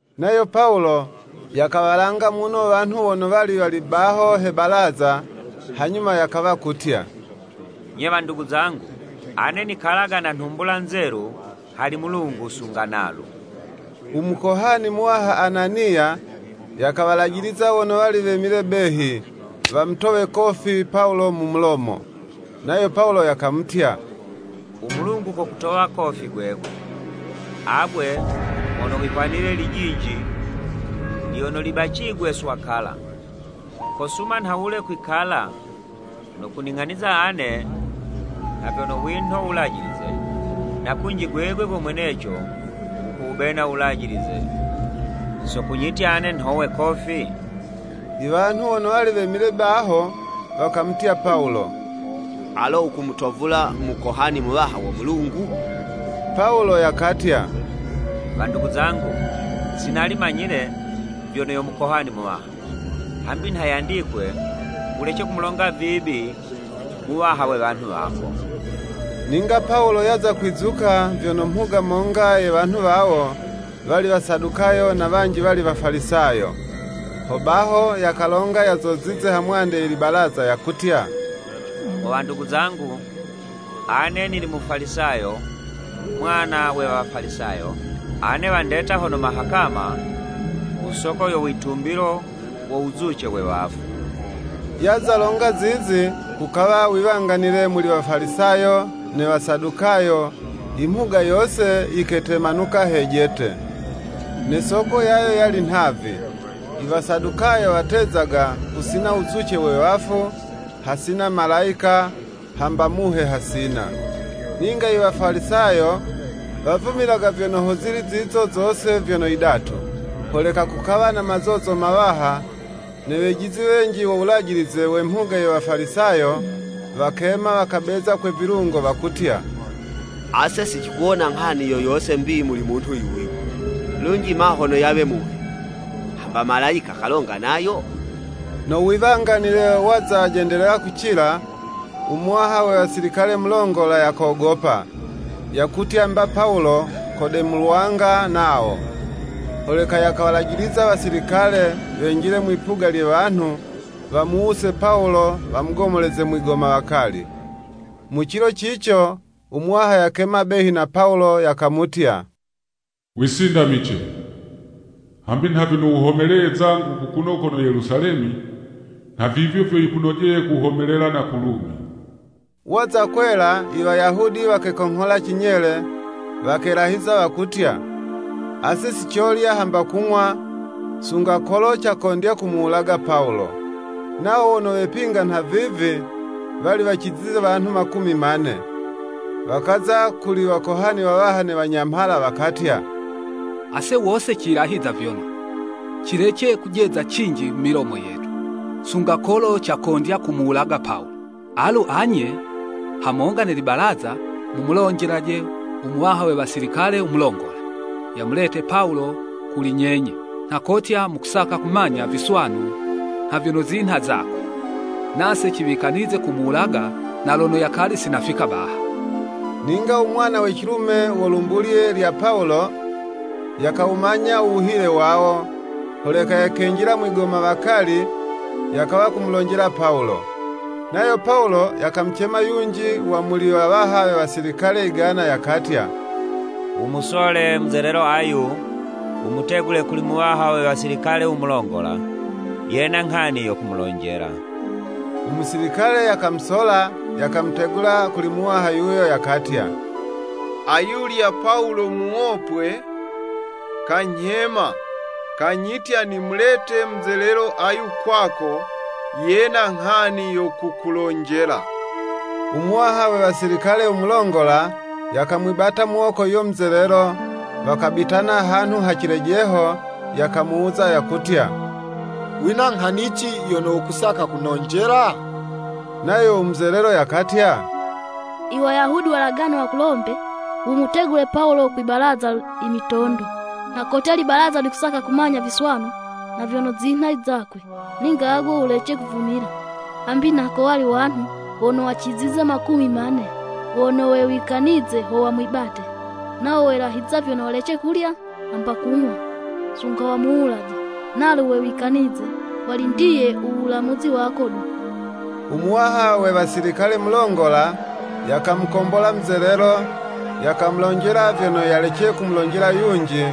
Nayo Pawulo, yakawalanga muno wanhu wono wali wali baho he balaza, hanyuma yakawa kutya, “Nye wandugu zangu, ane nikalaga na nhumbula nzelu hali Mulungu sunga nalu.” U mukohani muwaha Ananiya, yakawalajiliza wono wali wemile behi, wamutowe kofi Pawulo mu mulomo. Nayo Pawulo yakamutya, “U Mulungu kokutowa kofi gwegwe, agwe mono wihwanile lijinji lyono libacigwe swakala! Kosuma nhawule kwikala no kuning'aniza ane nha vyono winho Wulajilize, na kunji gwegwe go mweneco wukuwubena Wulajilize so kunyitya ane nhowe kofi?” Iwanhu wono wali wemile baho, wakamutya Pawulo, “Alo wukumutovula Mukohani Muwaha wo Mulungu?” Pawulo yakatya, “Wandugu zangu, si nali manyile, vyono yo Mukohani Muwaha, hambi nha yandikwe, Wulece kumulonga vibi muwaha we wanhu wako.” Ninga Pawulo yaza kwizuka, vyono mhuga monga ye wanhu wawo, wali Wasadukayo na wanji wali Wafalisayo. Hobaho yakalonga yazozize hamwande ye libalaza yakutya, “Mo wandugu zangu, ane nili Mufalisayo mwana we Wafalisayo, ane wandeta hono mahakama, ku soko yo witumbilo wo wuzuce we wafu.” Yaza longa zizi, kukawa wiwanganile muli Wafalisayo ne Wasadukayo, imhuga yose yiketemanuka wejete. Ne soko yayo yali nhavi, Iwasadukayo watezaga, kusina wuzuce we wafu, hasina malayika, hamba muhe hasina. Ninga Iwafalisayo wavumilaga vyono hozili zizo zose vyono yidatu. Holeka kukawa na mazozo mawaha, ne wejizi wenji wo wulajilize we mhuga ye Wafalisayo, wakema, wakabeza kwe vilungo, wakutya, “Ase si cikuwona nghani yo yose 'mbi muli munhu yuyu, lunji ma hono yawe muhe, hamba malayika kalonga nayo?” No wiwanganile waza jendelela kucila, u muwaha we wasilikale mulongola, yakogopa, yakutya mba Pawulo kodemulwanga nawo. Holeka yakawalajiliza wasilikale, wenjile mwipuga lye wanhu, wamuwuse Pawulo wamugomoleze mwigomawakali. Mu cilo cico, u Muwaha yakema behi na Pawulo, yakamutya, “Wisindamice, hambi nha vyono wuhomeleye zangu kukuno kono Yelusalemi, nha vivyo vyo yikunojeye kuhomelela na ku Lumi.” Waza kwela, Iwayahudi wakekonghola cinyele, wakelahiza wakutya, “Ase sicolya hamba kung'wa, sunga kolo cakondya kumuwulaga Pawulo.” Nawo wono wepinga nhavivi, wali wacizize wanhu makumi mane. Wakaza kuli wakohani wawaha ne wanyamhala, wakatya, “Ase wose cilahiza vyono, cilece kujeza cinji mu milomo yetu, sunga kolo cakondya kumuwulaga Pawulo. Alu anye, hamonga ne libalaza, mumulonjele u muwaha we wasilikale u mulongola, yamulete Pawulo kuli nyenye nha kotya mukusaka kumanya viswanu nha vyono zinha zakwe. Nase ciwikanize kumuwulaga na lono yakali si yanafika baha.” Ninga u mwana we cilume wo lumbulye lya Pawulo, yakawumanya u wuhile wawo, holeka yakenjila mwigomawakali, yakawa kumulonjela Pawulo. Nayo Pawulo yakamucema yunji wa muli wawaha we wasilikale yigana, yakatya, “Wumusole muzelelo ayu, wumutegule kuli muwaha we wasilikale u mulongola, yena nghani yo kumulonjela.” Umusilikale yakamusola, yakamutegula kuli muwaha yuyo, yakatya, “Ayulya Pawulo muwopwe, kanyhema, kanyitya nimulete muzelelo ayu kwako, yena nghani yo kukulonjela.” Umuwaha we wasilikale u mulongola, yakamwibata muwoko yuyo muzelelo, wakabitana hanhu ha cilejeho, yakamuwuza yakutya, “Wina nghani ci yono wukusaka kunonjela?” Nayo u muzelelo yakatya, “Iwayahudi walagane wakulombe, wumutegule Pawulo kwi balaza imitondo, nha kotya libalaza likusaka kumanya viswanu nha vyono zinha izakwe. Ninga agwe wulece kuvumila, hambi nha kowali wanhu wono wacizize makumi mane wono wewikanize ho wamwibate. Nawo welahiza vyono walece kulya hamba kung'wa sunga wamuwulaje. Nalu wewikanize, walindiye uwulamuzi wako du.” Umuwaha we wasilikale mulongola, yakamukombola muzelelo, yakamulonjela vyono yalece kumulonjela yunji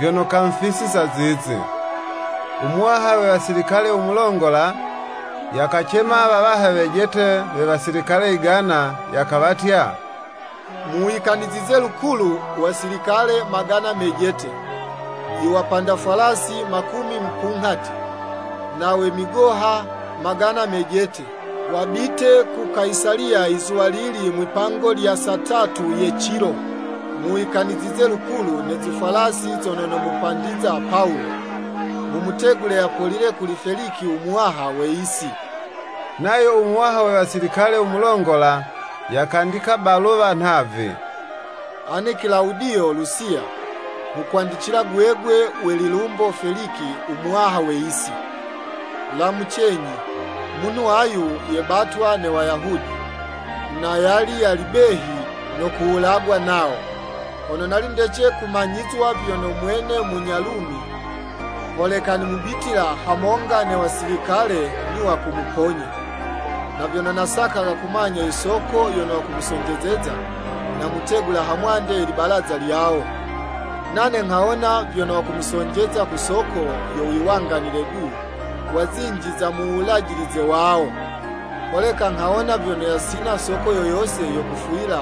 vyono kamufisiza zizi. Umuwaha we wasilikale u mulongola, yakacema wawaha wejete we wasilikale yigana, yakawatya, “Muwikanizize lukulu wasilikale magana mejete, iwapanda fwalasi makumi mupunghati, na we migoha, magana mejete, wabite ku Kayisaliya izuwalili mwipango lya saa tatu ye cilo. Muwikanizize lukulu ne zifwalasi zono momupandiza Pawulo, mumutegule yapolile kuli Feliki u muwaha we yisi.” Nayo u muwaha we wasilikale u mulongola yakandika baluwa nhavi: “Ane Kilawudiyo Lusiya, nghukwandicila gwegwe we lilumbo Feliki umuwaha we yisi, Lamucenyi! Munhu ayu, yebatwa ne Wayahudi, na yali yali behi no kuwulagwa nawo, hono nali ndece kumanyizwa vyono mwene munya Lumi, holeka nimubitila hamonga ne wasilikale niwa kumuponya. Na vyono nasakaga kumanya yisoko yono wakumusonjezeza, namutegula hamwande ye libalaza lyawo. Nane nghawona vyono wakumusonjeza ku soko yo wiwanganile du wa zinji za mu wulajilize wawo, holeka nghawona vyono yasina soko yo yose yo kufwila,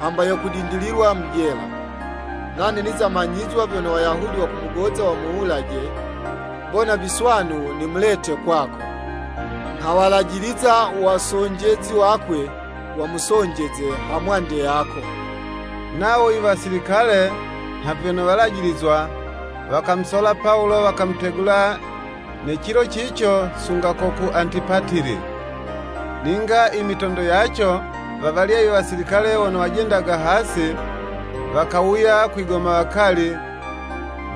hamba yo kudindililwa mu jela. Nane niza manyizwa vyono Wayahudi wakumugoza wamuwulaje, mbona viswanu nimulete kwako. Nghawalajiliza wasonjezi wakwe wamusonjeze ha mwande yako.” Nawo iwasilikale, nha vyono walajilizwa, wakamusola Pawulo, wakamutegula ne cilo cico sunga ko ku Antipatili. Ninga imitondo yaco wawalya iwasilikale wono wajendaga hasi, wakawuya kwigomawakali,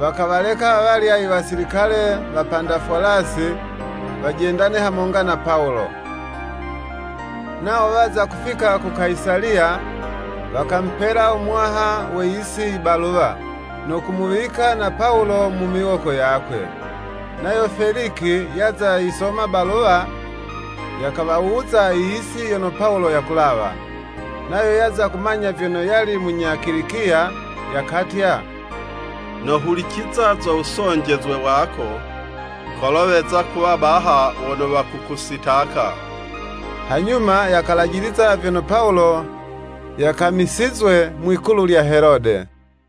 wakawaleka awalya iwasilikale wapanda Fwalasi, wajendane hamonga na Pawulo. Nawo waza kufika ku Kayisaliya, wakamupela u muwaha we yisi ibaluwa, no kumuwika na Pawulo mu miwoko yakwe. Nayo Feliki yaza yisoma baluwa, yakawawuza iyisi yono Pawulo yakulawa. Nayo yaza kumanya vyono yali munya Kilikiya, yakatya, “Nohuliciza zo wusonjezwe wako, kolo weza kuwa baha wono wakukusitaka.” Hanyuma yakalajiliza vyono Pawulo yakamisizwe mwikulu lya Helode.